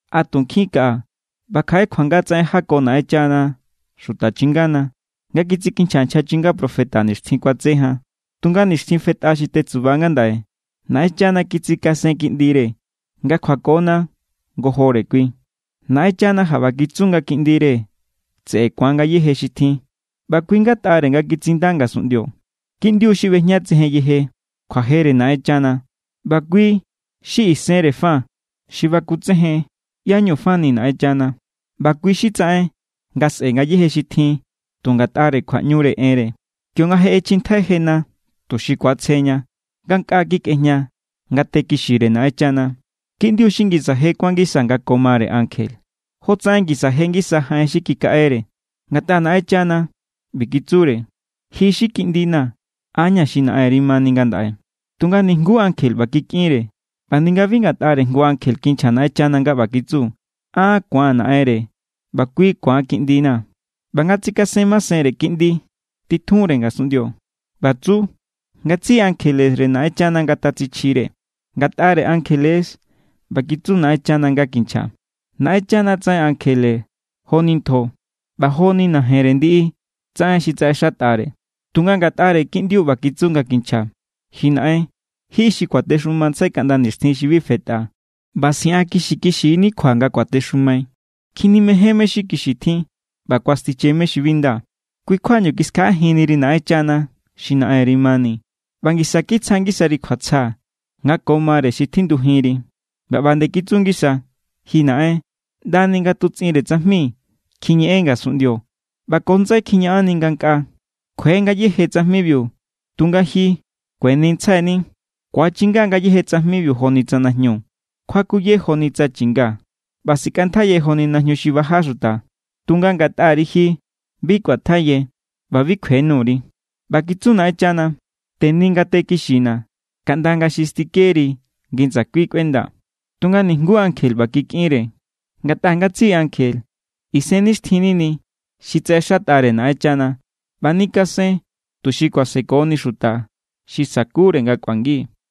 A tu nkjin kaꞌa ꞌba kjaꞌe kjuanga tsaꞌen jako Naꞌenchana xuta chingana nga kitsikinchja nchja chinga profeta nixtjin kuatse jan. Tunga nixtjin fetꞌa xi tetsuba ngandaꞌe Naꞌenchana kitsikasen Kiꞌndire nga kjuakona ngojore kui. Naꞌenchana jaꞌba kitsu nga Kiꞌndire tseꞌe ku̱an ngayéje xi tjin, ꞌba kui= ngatꞌare nga kitsinda ngasunꞌndio. Kiꞌndiu xi ꞌbejñatsejen yeje kjuajere Naꞌenchana, ꞌba kui= xi isenre fa xi bakutsejen ꞌyá=ñu fani Naꞌenchana, ꞌba kui xi tsaꞌen nga sꞌe ngayéje xi tjin tu ngatꞌare kjuaꞌñure enre. Kionga je ꞌechjintjai jena tuxi ku̱atsjeña, ngankꞌaa kikꞌejña ngate kixire Naꞌenchana. Kiꞌndiu xi ngisa je kuán ngisa nga ko mare ankje, jotsaꞌen ngisa je ngisa jaꞌen xi kikaꞌere. Ngatꞌa Naꞌenchana ꞌbi kitsure: “Ji xi Kiꞌndina̱, an= ña̱ xi Naꞌenri mani ngandaꞌe.” Tunga nijnguú ankje ꞌba kikꞌinre. ꞌBa ninga bi ngatꞌare jngu ankje kinchja Naꞌenchana nga ꞌba kitsu: “An ku̱an Naꞌenre, ꞌba kui ku̱an Kiꞌndina̱.” ꞌBa nga tsikasen masenre Kiꞌndi titjunre ngasunꞌndio, ꞌba tsu: “Ngatsiꞌi ankjelere Naꞌenchana ngatatsichjire.” Ngatꞌare ankjele= ꞌba kitsu Naꞌenchana nga kinchja: “Naꞌenchana tsaꞌen ankjelere joni ntjo, ꞌba joni najenre ndiꞌi tsaꞌen xi tsaꞌexatꞌare.” Tunga ngatꞌare Kiꞌndiu ꞌba kitsu nga kinchja: Ji Naꞌen, ji xi kuatexumantsjai kaꞌnda nixtjin xi bi fetꞌa, ꞌba siꞌankixikixi=ni kjua nga kuatexumai. Kjinimején mé= xi kixi tjin, ꞌba kuastiche mé= xi bi nda. Kui= kjuañu kiskjaꞌajinniri Naꞌenchana xi Naꞌenri mani, ꞌba ngisa kitsja ngisari kjuatsja nga ko mare xi tjindujinri. ꞌBa ꞌba nde kitsu ngisa: Ji Naꞌen, ꞌndani ngatutsꞌinre tsajmi kjiñeꞌen ngasunꞌndio, ꞌba ko ndsai kjiñaꞌanni ngankꞌaa. Kjue ngayéje tsajmibiu, tunga ji kuenintsjaini. Ku̱achinga= ngayéje tsajmibiu joni tsa najñu. Kjuakuye joni tsa chi̱nga, ꞌba sikꞌantjaiye joni najñu xi baja xuta. Tunga ngatꞌari ji, bi kꞌuantjaiye, ꞌba bi kjue nuri. ꞌBa kitsu Naꞌenchana: “Teni ngate kixina̱ kaꞌnda nga xi stikeri ngi ndsakui kꞌuendaa̱.” Tunga nijnguú ankje ꞌba kikꞌinre. Ngatꞌa ngatsiꞌi ankje isennixtjin nini xi tsaꞌexatꞌare Naꞌenchana ꞌba nikasen tuxi kuasekoni xuta xi sa̱kure nga kꞌuangi.